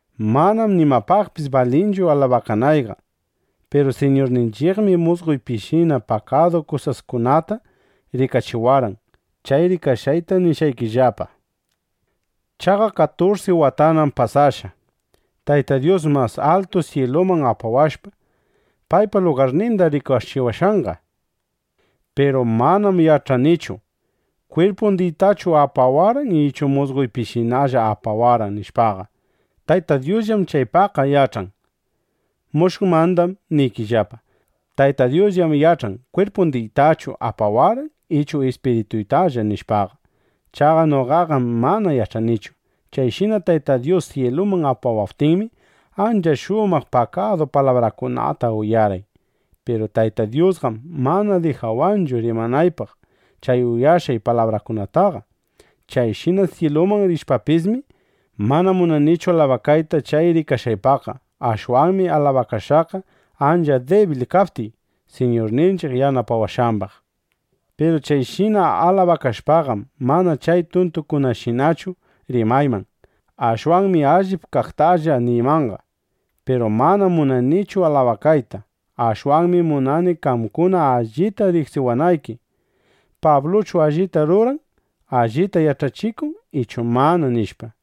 Manam nimapaqpis balinchu alabakanayqa. Piru Siñurninchiqmi musqoypishina pakadu kusaskunata rikachiwarqan. Chay rikashqayta nishqaykillapa. Chaqa katursi watanam pasashqa, Tayta Dyus mas altu syiluman apawashpa, paypa lugarninda rikachiwashqanqa. Piru manam yach'anichu: Kwirpundiytachu apawarqan ichu musqoypishinalla apawarqan, nishpaqa. Tayta Dyusllam chaypaqqa yach'an. Mushuqmandam niriykillapa, Tayta Dyusllam yach'an kwirpundiytachu apawarqan ichu ispirituytalla, nishpaqa. Chaqa noqaqam mana yach'anichu. Chayshina Tayta Dyus syiluman apawaptinmi, ancha shumaq pakadu palabrakunata uyarqay. Piru Tayta Dyusqam mana dijawanchu rimanaypaq chay uyashqay palabrakunataqa. Chayshina syiluman rishpapismi, mana munanichu alabakayta chay rikashqaypaqqa. Ashwanmi alabakashaqqa ancha dibil kaptiy, Siñurninchiq yanapawashqambaq. Piru chayshina alabakashpaqam, mana chay tuntukunashinachu rimayman. Ashwanmi allip kaqtalla niymanqa. Piru manam munanichu alabakayta. Ashwanmi munani qamkuna allita riqsiwanayki: ¿Pabluchu allita ruran, allita yach'achikun ichu mana? nishpa.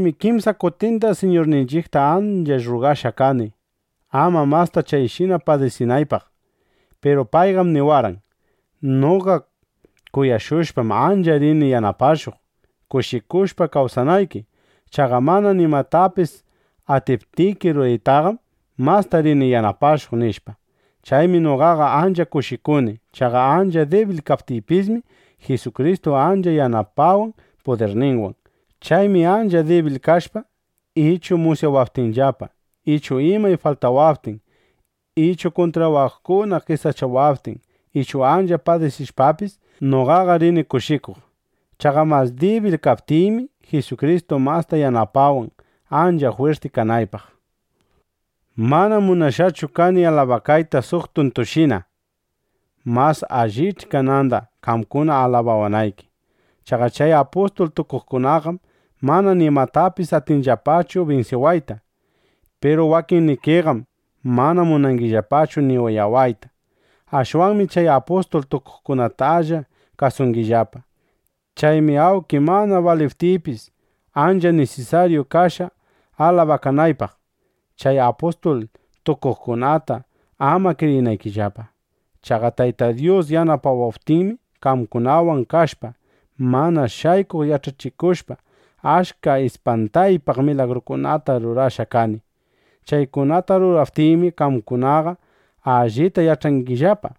Chaymi kimsa kutinda Siñurninchiqta ancha rrugashqa kani, ama masta chayshina padisinaypaq. Piru payqam niwarqan: “Noqa kuyashushpam, ancha rini yanapashuq, kushikushpa kawsanayki. Chaqa mana nimatapis atiptiki ruraytaqam, masta rini yanapashuq”, nishpa. Chaymi noqaqa ancha kushikuni. Chaqa ancha dibil kaptiypismi, Jisukristu ancha yanapawan pudirninwan. Chaymi ancha dibil kashpa ichu musyawaptinllapa ichu imay faltawaptin ichu kuntrawaqkuna qesachawaptin ichu ancha padisishpapis, noqaqa rini kushikuq. Chaqa mas dibil kaptiymi, Jisukristu masta yanapawan, ancha jwirti kanaypaq. Manam munashqachu kani alabakayta suq tuntushina. Mas allich'i kananda, qamkuna alabawanayki. Chaqa chay apustul tukuqkunaqam mana nimapipis atinllapachu binsiwayta. Piru wakinnikiqam mana munangillapachu ni uyawayta. Ashwanmi chay apustul tukuqkunatalla kasungillapa. Chaymi awnki mana baliptiypis, ancha nisisaryu kashqa, alabakanaypaq, chay apustul tukuqkunata ama kriyinaykillapa. Chaqa Tayta Dyus yanapawaptinmi, qamkunawan kashpa, mana shaykuq yach'achishushpa, achka ispantaypaq milagrukunata rurashqa kani. Chaykunata ruraptiymi, qamkunaqa allita yach'arqaykillapa: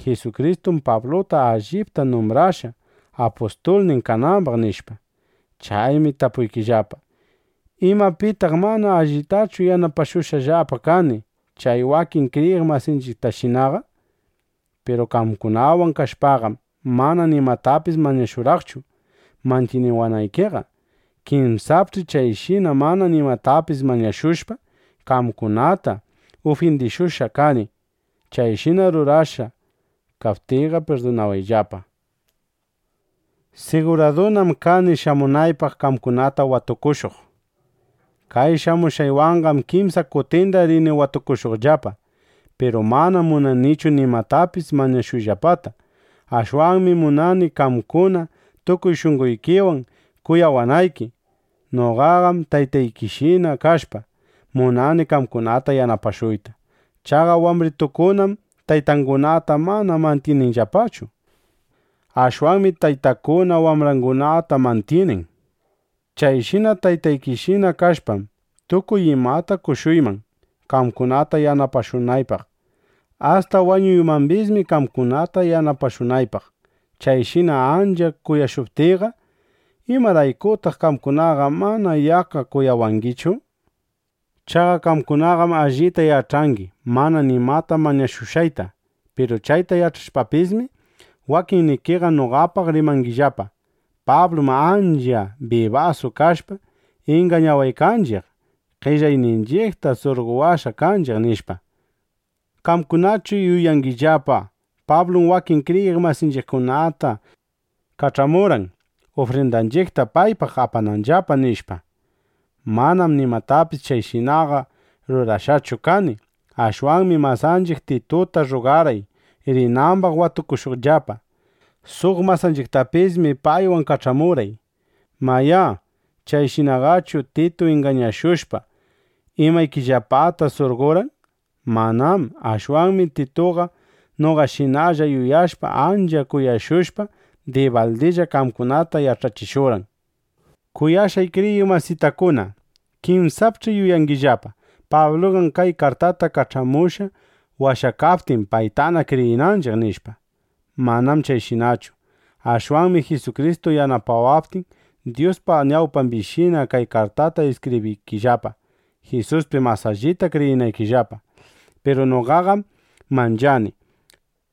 Jisukristum Pabluta allipta numbrashqa, apustulnin kanambaq, nishpa. Chaymi tapuykillapa: ¿Imapitaq mana allitachu yanapashushqallapa kani chay wakin kriyiq masinchiqtashinaqa? Piru qamkunawan kashpaqam, mana nimatapis mañashurqaqchu mantyiniwanaykiqa. Kinsapch'i chayshina mana nimatapis mañashushpa, qamkunata ufyindishushqa kani. Chayshina rurashqa kaptiyqa, pirdunawayllapa. Siguradunam kani shamunaypaq qamkunata watukushuq. Kay shamushqaywanqam kimsa kutinna rini watukushuqllapa. Piru manam munanichu nimatapis mañashuyllapata. Ashwanmi munani, qamkuna tukuy shunqoykiwan kuyawanayki. (Noqaqam taytaykishina kashpa, munani qamkunata yanapashuyta.) Chaqa wambritukunam taytangunata mana mantyininllapachu. Ashwanmi taytakuna wambrangunata mantyinin. Chayshina taytaykishina kashpam, tukuy imayta qoshuyman, qamkunata yanapashunaypaq. Asta wañuymambismi qamkunata yanapashunaypaq. Chayshina ancha kuyashuptiyqa, ¿imaraykutaq qamkunaqa mana yaqqa kuyawangichu? Chaqa qamkunaqam allita yach'angi mana nimata mañashushqayta. Piru chayta yach'ashpapismi, wakinnikiqa noqapaq rimangillapa: “Pablum, ancha bibasu kashpa, ingañawaqninchiq, qellayninchiqta surqowashqa kanchiq”, nishpa. ¿Qamkunaqachu yuyangillapa: Pablum wakin kriyiq masinchiqkunata kach'amurqan, ufrindanchiqta paypaq apananllapa, nishpa? (Manam nimatapis chayshinaqa rurashqachu kani.) Ashwanmi masanchiq Tituta rruqarqay, rinambaq watukushuqllapa. Suq masanchiqtapismi paywan kach'amurqay. Mayá, ¿chayshinaqachu Titu ingañashushpa, imaykillapata surqorqan? Manám. Ashwanmi Tituqa noqashinalla yuyashpa, ancha kuyashushpa, dibaldilla qamkunata yach'achishurqan. Kuyashqay kriyiq masitakuna, kinsapch'i yuyangillapa: Pabluqam kay kartata kach'amushqa, washakaptin, paytana kriyinanchiq, nishpa. Manam chayshinachu. Ashwanmi Jisukristu yanapawaptin, Dyuspa ñawpambishina kay kartata iskibriykillapa, Jisuspi mas allita kriyinaykillapa. Piru noqaqam manchani: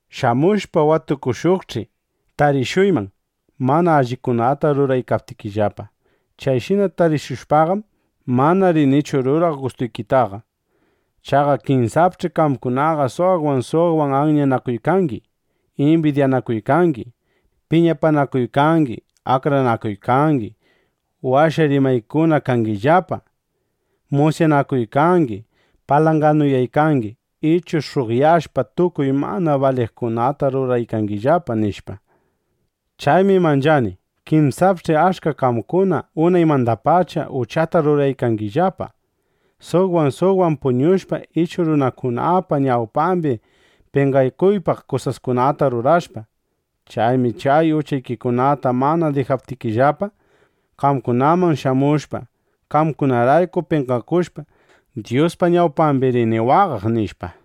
Shamushpa watukushuqch'i, tarishuyman, mana allikunata ruraykaptikillapa. Chayshina tarishushpaqam, mana rinichu ruraq gustuykitaqa. Chaqa kinsapch'i qamkunaqa suqwan suqwan anyanakuykangi, imbidyanakuykangi, piñapanakuykangi, akranakuykangi, washa rimaykuna kangillapa, musyanakuykangi, palanganuyaykangi ichu sh'uqyashpa, tukuy mana baliqkunata ruraykangillapa, nishpa. Chaymi manchani: Kinsapch'i achka qamkuna unaymandapacha uchata ruraykangillapa, suqwan suqwan puñushpa ichu runakunapa ñawpambi penqakuypaq kusaskunata rurashpa. Chaymi chay uchaykikunata mana dijaptikillapa, qamkunaman shamushpa, qamkunarayku penqakushpa, Dyuspa ñawpambi rini waqaq, nishpa.